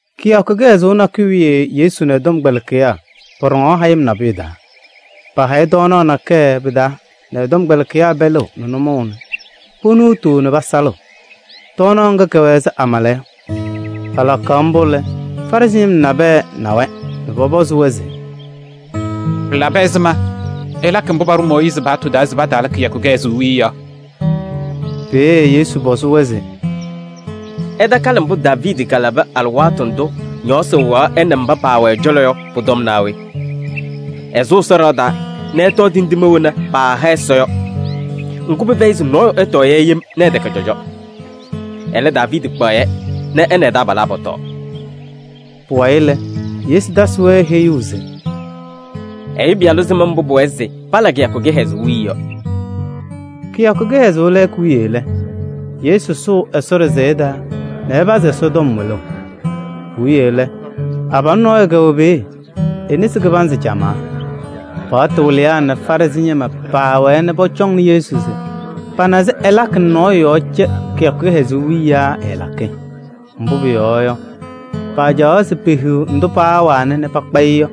Kɩyakʋ kɩhɛzʋʋ nakʋyʋ wiye Yesu nɛ ɛ-tɔmkpɛlɩkɩyaa pɔɖɔŋaɣ hayɩm nabʋyʋ taa. Paahayɩ tɔɔnaɣ nakɛyɛ pɩ-taa nɛ ɛ-tɔmkpɛlɩkɩyaa pɛlɩɣ nɛ nʋmɔʋ nɛ ponuutuu nɛ pasalɩɣ. Tɔɔnaɣ ŋga kɛwɛ ɛzɩ amala yɔ. Palakaɣ mbʋ lɛ, Farɩsɩ ñɩma nabɛyɛ na-wɛ nɛ pɔpɔzɩ-wɛ se: “Pɩlabɩ ɛzɩma ɩlakɩ mbʋ paɖʋ Mooyiizi paɣtʋ taa se pataala kɩyakʋ kɩhɛzʋʋ wiye yɔ?” Peeye Yesu pɔzɩ-wɛ se: “Ɩtakalɩ mbʋ Daaviidi kalabɩ alɩwaatʋ ndʋ ñɔɔsɩ wɩɣaɣ ɛ nɛ mba paawɛ ɛ-cɔlɔ yɔ pʋ-tɔm naa we? Ɛsʋ Ɛsɔ ɖɩɣa taa nɛ ɛtɔɔ tindine wena paaha Ɛsɔ yɔ. Ŋgʋ, pɩfɛyɩ se nɔɔyʋ ɛtɔɔ-yɛ yem nɛ ɛtɛkɛ cɔjɔ. Ɛlɛ, Daaviidi kpaɣ-yɛ nɛ ɛ nɛ ɛ-taabalaa pɔtɔɔ” Pʋwayɩ lɛ, Yesu tasɩ-wɛ heyuu se: “Ɛyʋ Pɩyalʋ sɩm mbʋ pʋwɛɛ se pala kɩyakʋ kɩhɛzʋʋ wiye yɔ.” Kɩyakʋ kɩhɛzʋʋ lɛɛkʋ wiye lɛ, Yesu sʋʋ Ɛsɔ ɖɩsɛyɛ taa nɛ ɛpazɩ Ɛsɔtɔm wɩlʋʋ. Puwiye lɛ, abalʋ nɔɔyʋ kɛwɛ peeye, e-nesi kɩbanzɩ camaa. Paɣtʋ wɩlɩyaa nɛ Farɩsɩ ñɩma paawɛɛ nɛ pɔcɔŋnɩ Yesu se pana se ɛlakɩ nɛ nɔɔyʋ yɔɔ cɛ kɩyakʋ kɩhɛzʋʋ wiye yaa ɛɛlakɩ? Mbʋ pʋyɔɔ yɔ, pacaɣ se pehiɣ ndʋ paawana nɛ pakpa-ɩ yɔ.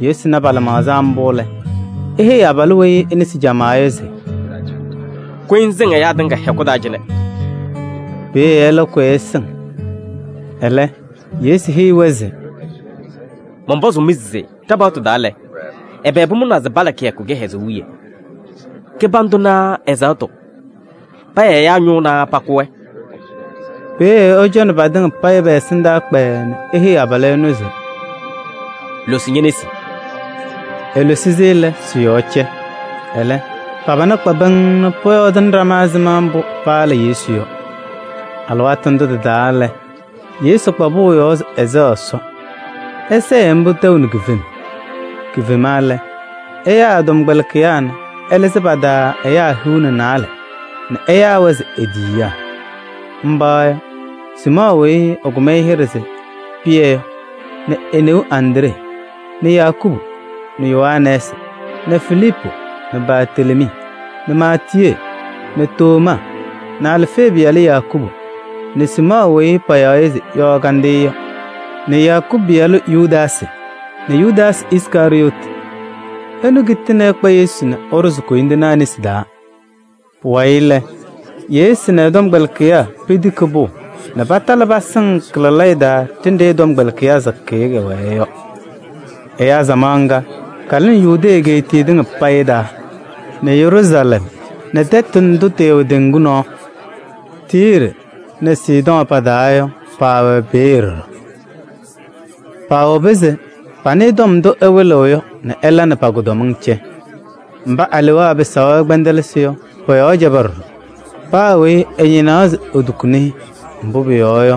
Yesu na pa-lɩmaɣza mbʋ lɛ, eheyi abalʋ weyi e-nesi camaa yɔ se: “Kʋyɩ ŋsɩŋ ɛyaa tɩŋa hɛkʋ taa cɩnɛ!” Peeye ɛlɛ kʋyaa ɛsɩŋ. Ɛlɛ Yesu heyi-wɛ se: “Mɔnpɔzʋʋ-mɩ se ɖa-paɣtʋ taa lɛ, ɛbɛ pʋmʋnaa se pala kɩyakʋ kɩhɛzʋʋ wiye? Kɩbandʋ naa ɛzaɣtʋ? Paya ɛyaa ñʋʋ naa pakʋ-wɛ?” Peeye ɛcɔnɩ patɩŋa pɛ-ɛsɩndaa kpɛɛɛ nɛ eheyi abalʋ ɛnʋ se: “Losi ñe-nesi!” Elosi-si lɛ, sɩ-yɔɔ cɛ. Ɛlɛ, pa-pana kpa pɩŋŋ nɛ pɔyɔɔdʋʋnɩ ɖama ɛzɩma mbʋ paala Yesu yɔ. Alɩwaatʋ ndʋ tɩ-taa lɛ, Yesu kpa pʋʋ yɔɔ se ɛsɛɣ Ɛsɔ. Ɛsɛɛ-ɩ mbʋ tɛʋ nɛ kifem. Kifema lɛ, ɛyaa ɛ-tɔmkpɛlɩkɩyaa nɛ ɛlɩzɩ pa-taa ɛyaa hiu nɛ naalɛ nɛ ɛyaa-wɛ se e-tiyiyaa. Mba yɔ: Siimɔɔ weyi ɛkʋm-ɩ hɩɖɛ se Pɩyɛ yɔ nɛ e-neu Andree nɛ Yakubu nɛ Yohanɛɛsɩ nɛ Filiipu nɛ Bartelemii nɛ Maatiyee nɛ Tomaa nɛ Alfee pɩyalʋ Yakubu nɛ Siimɔɔ weyi payaɣ se Yɔɔ Kandɩyʋ yɔ nɛ Yakubu pɩyalʋ Yudaasɩ nɛ Yudaasɩ Iskarɩyɔɔtɩ. Ɛnʋ kitini ɛkpa Yesu nɛ ɛɖʋzɩ koyindinaa nesi taa. Pʋwayɩ lɛ, Yesu nɛ ɛ-tɔmkpɛlɩkɩyaa petiki pʋʋ nɛ patalɩ pasɩŋ kɩ-lalayɛ taa ɖenɖe ɛ-tɔmkpɛlɩkɩyaa sakɩyɛ kɛwɛɛ yɔ. Ɛyaa samaɣ ŋga kalɩnɩ Yudee egeetiye tɩŋa payɩ taa nɛ Yeruusalɛm nɛ tɛtʋ ndʋ tɩwɛ teŋgu nɔɔ: Tiiri nɛ Sidɔɔ pa-taa yɔ, paawɛ peeye ɖɔɖɔ. Paawobi se panɩɩ tɔm ndʋ ɛwɩlɩɣ yɔ nɛ ɛla nɛ pa-kʋdɔmɩŋ cɛ. Mba alewaa pɩsaɣ-wɛ kpɛndɛlɩsɩ yɔ, pɔ-yɔɔ cɛba ɖɔɖɔ. Paa weyi ɛñɩnaɣ se etukuni-i. Mbʋ pʋyɔɔ yɔ,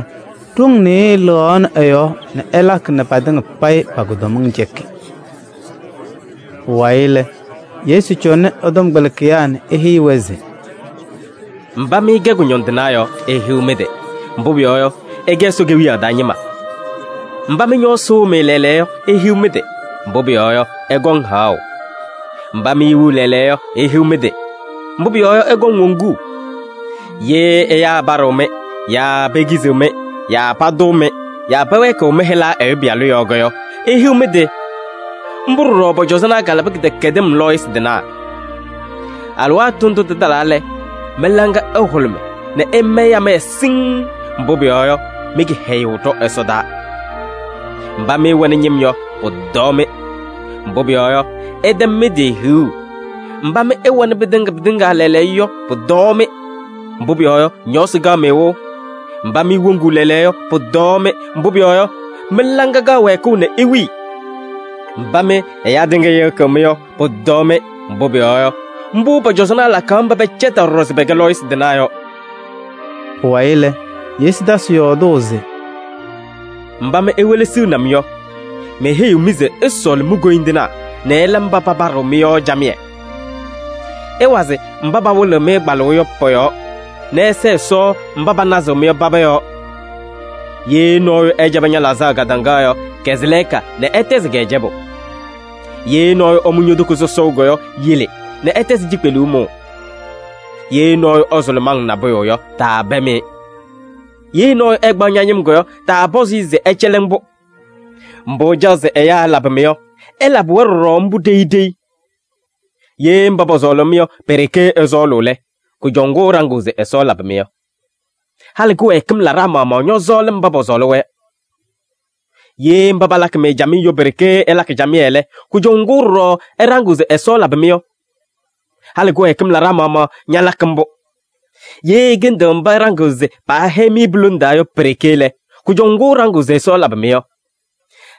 ɖoŋ nɩɩyɩ lɩɣaɣ ɛ-yɔɔ nɛ ɛlakɩ nɛ patɩŋa payɩ pa-kʋdɔmɩŋ cɛkɩ. Pʋwayɩ lɛ, Yesu cɔnɩ ɛ-tɔmkpɛlɩkɩyaa nɛ eheyi-wɛ se: “Mba mɩ ɩkɛ kʋñɔndɩnaa yɔ, ihiɣ mɩ-tɩ! Mbʋ pʋyɔɔ yɔ, ɩkɛ Ɛsɔ Kewiyaɣ taa ñɩma. Mba mɩ ñɔɔsɩ wɩɣ-mɩ lɛɛlɛɛyɔ yɔ, ihiɣ mɩ-tɩ! Mbʋ pʋyɔɔ yɔ, ɩkɔŋ haɣʋ. Mba mɩ iwiɣ lɛɛlɛɛyɔ yɔ, ihiɣ mɩ-tɩ! Mbʋ pʋyɔɔ yɔ, ɩkɔŋ woŋuu. Ye ɛyaa ɛpaɖɩɣ-mɩ yaa pekiziɣ-mɩ yaa patʋʋ-mɩ yaa pɛwɛɛkɩɣ mɩ-hɩla Ɛyʋ Pɩyalʋ yɔɔ yɔ, ihiɣ mɩ-tɩ! Mbʋ ɖɔɖɔ pɔ-cɔzɔnaa kalabɩ kɩdɛkɛdɩm lɔɔyɩsɩ tɩnaa. Alɩwaatʋ ndʋ tɩtalaa lɛ, mɩ-laŋa ɩhʋlʋmɩ nɛ ɩmayɩ amaya siŋŋ, mbʋ pʋyɔɔ yɔ, mɩ-kɩhɛyʋʋ ɖɔ ɛsɔdaa! Mba mɩ ɩwɛnɩ ñɩm yɔ, pʋtɔɔ-mɩ. Mbʋ pʋyɔɔ yɔ, ɩtɛm mɩ-tɩ hiɣu. Mba mɩ ɩwɛnɩ pɩtɩŋa pɩtɩŋa lɛɛlɛɛyɔ yɔ, pʋtɔɔ-mɩ! Mbʋ pʋyɔɔ yɔ, ñɔɔsɩ kaɣ-mɩ wɩʋ. Mba mɩ iwoŋuu lɛɛlɛɛyɔ yɔ, pʋtɔɔ-mɩ! Mbʋ pʋyɔɔ yɔ, mɩ-laŋa kaɣ wɛɛkʋʋ nɛ iwili. Mba mɩ ɛyaa tɩŋa yɩɣyɩɣ-mɩ yɔ, pʋtɔɔ-mɩ! Mbʋ pʋyɔɔ yɔ, mbʋ pɔ-cɔzɔnaa lakaɣ mba pɛcɛtaɣ ɖɔɖɔ se pɛkɛ lɔɔyɩsɩ tɩnaa yɔ.” Pʋwayɩ lɛ, Yesu tasɩ yɔɔdʋʋ se: “Mba mɩ iwelesiɣni-m yɔ, meheyiɣ-mɩ se ɩsɔɔlɩ mi-koyindinaa nɛ ɩla mba papaɖɩɣ-mɩ yɔ camɩyɛ. Ɩwazɩ mba pawɩlɩɣ-mɩ kpalʋʋ yɔ pɔ-yɔɔ nɛ ɩsɛɛ Ɛsɔ mba panazɩɣ-mɩ yɔ paba yɔɔ. Ye nɔɔyʋ ɛcɛbɩ ña-laɣzaɣ kadaŋa yɔ, kɛzɩ lɛɛka nɛ ɛtɛzɩ-kɛ cɛbʋ. Ye nɔɔyʋ ɛmʋ ño-toko sɔsɔʋ yɔ, yele nɛ ɛtɛzɩ cikpeluu mʋʋ. Ye nɔɔyʋ ɛsʋlʋmɩ-ŋ nabʋyʋ yɔ, taapɛm-ɩ. Ye nɔɔyʋ ɛkpaɣ ña-ñɩm yɔ, taapɔzɩ-ɩ se ɛcɛlɩ-ŋ-pʋ. Mbʋ ɩcaɣ se ɛyaa ɛlabɩ-mɩ yɔ, ɩlabɩ-wɛ ɖɔɖɔ mbʋ ɖeyi ɖeyi. Ye mba pɔsɔɔlɩ-mɩ yɔ pe-ɖeke ɩsɔɔlʋʋ lɛ, kʋjɔʋ ŋgʋ ɩɖaŋɩɣ se Ɛsɔ ɛlabɩ-mɩ yɔ? Halɩ kɩwɛɛkɩm laɖaa maɣmaɣ ñɔsɔɔlɩ mba pɔsɔɔlɩ-wɛ yɔ. Ye mba palakɩ-mɩ camɩyɛ yɔ pe-ɖeke ɩlakɩ camɩyɛ lɛ, kʋjɔʋ ŋgʋ ɖɔɖɔ ɩɖaŋɩɣ se Ɛsɔ ɛlabɩ-mɩ yɔ? Halɩ kɩwɛɛkɩm laɖaa maɣmaɣ ñalakɩ mbʋ. Ye ɩkɩndɩɣ mba ɩɖaŋɩɣ se paahɛyɩ-mɩ pu-lone taa yɔ pe-ɖeke lɛ, kʋjɔʋ ŋgʋ ɩɖaŋɩɣ se Ɛsɔ ɛlabɩ-mɩ yɔ?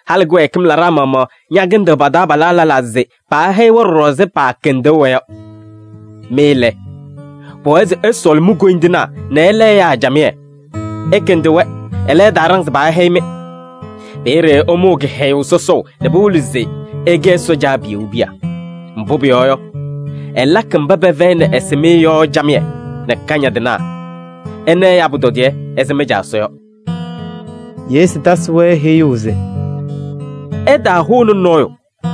Halɩ kɩwɛɛkɩm laɖaa maɣmaɣ ñakɩndɩɣ pa-taabalaa lɛlaa se paahɛyɩ-wɛ ɖɔɖɔ ɛzɩ paakɩndʋʋ-wɛ yɔ. Mɩ lɛ, pʋwɛɛ se ɩsɔɔlɩ mi-koyindinaa nɛ ɩla ɛyaa camɩyɛ. Ɩkɩndɩ-wɛ, ɛlɛ, ɩtaaɖaŋ se paahɛyɩ-mɩ. Peeye ɩmʋʋ kɩhɛyʋʋ sɔsɔʋ nɛ pɩwɩlɩ se ɩkɛ Ɛsɔ Caabiyuu piya. Mbʋ pʋyɔɔ yɔ, ɛlakɩ mba pɛfɛyɩnɩ ɛsɩmɩyɛ yɔ camɩyɛ nɛ kañadɩnaa. Ɩna ɛyaa pʋtɔdɩyɛ ɛzɩ mɩ-Caa Ɛsɔ yɔ.” Yesu tasɩ-wɛ heyuu se: “Ɩtaahʋnɩ nɔɔyʋ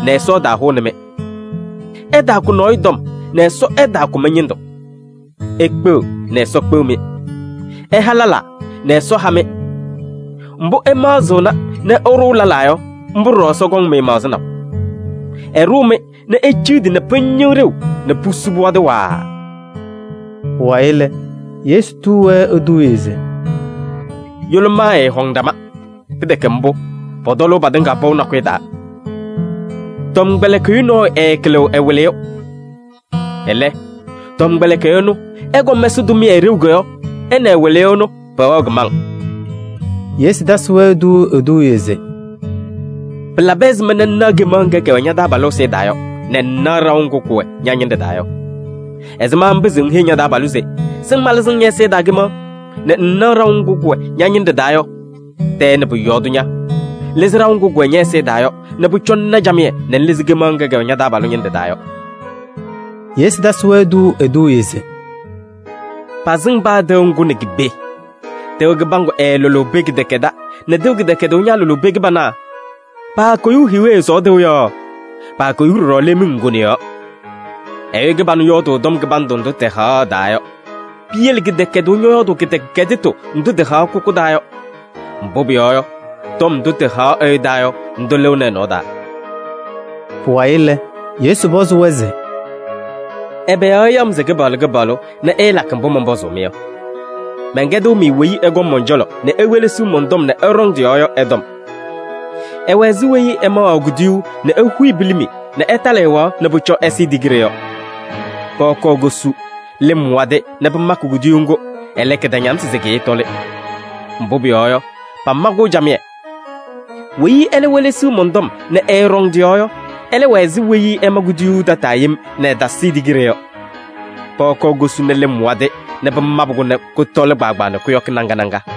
nɛ Ɛsɔ ɛtaahʋnɩ-mɩ. Ɩtaakʋ nɔɔyʋ tɔm nɛ Ɛsɔ ɛtaakʋ mɩ-ñɩndʋ. Ikpeɣ nɛ Ɛsɔ kpeɣ-mɩ. Ɩha lɛlaa nɛ Ɛsɔ ha-mɩ. Mbʋ ɩmaɣzɩɣna nɛ ɩɖʋʋ lɛlaa yɔ, mbʋ ɖɔɖɔ Ɛsɔ kɔŋ-mɩ maɣzɩnaʋ. Ɛɖʋʋ-mɩ nɛ eciɣdi nɛ pɩñɩɣ ɖeu nɛ pusu pɩwadɩ waaa.” Pʋwayɩ lɛ, Yesu tuu-wɛ eduuye se: “Yʋlʋmaa ɛɛhɔŋ ɖama. Pɩtɛkɛ mbʋ, pɔtɔlʋʋ patɩŋa pɔʋ nakʋyʋ taa. Tʋmɩyɛ tɔmkpɛlɩkɩyʋ nɔɔyʋ ɛɛkɩlɩɣ ɛ-wɩlɩyʋ. Ɛlɛ, tɔmkpɛlɩkɩyʋ ɛnʋ ɛkɔm ɛsɩ tʋmɩyɛ ɖeu yɔ, ɛ nɛ ɛ-wɩlɩyʋ ɛnʋ pɛwɛɣ kɩmaŋ.” Yesu tasɩ-wɛ tuuu eduuye se: “Pɩlabɩ ɛzɩma nɛ ŋnaɣ kemaɣ ŋga kɛwɛ ña-taabalʋ ɛzɩyɛ taa yɔ nɛ ŋŋnaɣ ɖaʋ ŋgʋ kʋwɛ ña-ñɩnɖɛ taa yɔ? Ɛzɩma ŋpɩzɩɣ ŋheyi ña-taabalʋ se: ‘Sɩŋ malɩzɩ-ŋ ñɛ-ɛzɩyɛ taa kemaɣ’ nɛ ŋŋnaɣ ɖaʋ ŋgʋ kʋwɛ ña-ñɩnɖɛ taa yɔ? Tɛɛ nɛ pʋ-yɔɔ tʋ ña! Lɩzɩ ɖaʋ ŋgʋ kʋwɛ ñɛ-ɛzɩyɛ taa yɔ nɛ pʋcɔ ŋna camɩyɛ nɛ ŋlɩzɩ kemaɣ ŋga kɛwɛ ña-taabalʋ ñɩnɖɛ taa yɔ.” Yesu tasɩ-wɛ tuuu eduuye se: “Pasɩŋ paa tɩʋ ŋgʋ nɛ ki-pee: tɩʋ kɩbaŋgʋ ɛɛlʋlʋʋ pee kɩdɛkɛdɛɛ nɛ tɩʋ kɩdɛkɛdʋʋ ñaalʋlʋʋ pee kɩbana. Paakoyuu hiiwe sɔɔɔ tɩʋ yɔɔ, paakoyuu ɖɔɖɔ leemiŋ ŋgone yɔɔ. Ɛyʋ kɩbanʋ yɔɔdʋʋ tɔm kɩbandʋ ndʋ tɩhaɣ ɛ-taa yɔ. Piyele kɩdɛkɛdʋʋ ñɔyɔɔdʋʋ kɩdɛkɛdɩtʋ ndʋ tɩhaɣ kʋkʋ taa yɔ. Mbʋ pʋyɔɔ yɔ, tɔm ndʋ tɩhaɣ ɛyʋ taa yɔ, ndʋ lɩɣnɩ ɛ-nɔɔ taa.” Pʋwayɩ lɛ, Yesu pɔzɩ-wɛ se: “Ɛbɛ yɔɔ ɩyaɣ-m se Kɩpaɣlʋ Kɩpaɣlʋ nɛ ɩɩlakɩ mbʋ mɔnpɔzʋʋ-mɩ yɔ? Mɛnkɛdɩɣ-mɩ weyi ɛkɔŋ mɔn-cɔlɔ nɛ ewelesiɣ mɔn-tɔm nɛ ɛɖɔŋ tɩ-yɔɔ yɔ ɛ-tɔm. Ɛwɛ ɛzɩ weyi ɛmaɣaɣ kuduyuu nɛ ehuyi pilimi nɛ ɛtalɩ ɛwaɣ nɛ pʋcɔ ɛsɩɩ tigiɖe yɔ. Pɔɔ kɔɔ kosu, lɩm wadɩ nɛ pɩmakɩ kuduyuu ŋgʋ, ɛlɛ, kɩtañamsɩ tɛ kɩɩtɔlɩ. Mbʋ pʋyɔɔ yɔ, pama-kʋ camɩyɛ. Weyi ɛlɛ welesiɣ mɔn-tɔm nɛ ɛɛɖɔŋ tɩ-yɔɔ yɔ, ɛlɛ wɛ ɛzɩ weyi ɛma kuduyuu tataa yem nɛ ɛtasɩɩ tigiɖe yɔ. Pɔɔ kɔɔ kosu nɛ lɩm wadɩ nɛ pɩmabɩ-kʋ nɛ kʋtɔlɩ kpaagbaa nɛ kʋyɔkɩ naŋa naŋa.”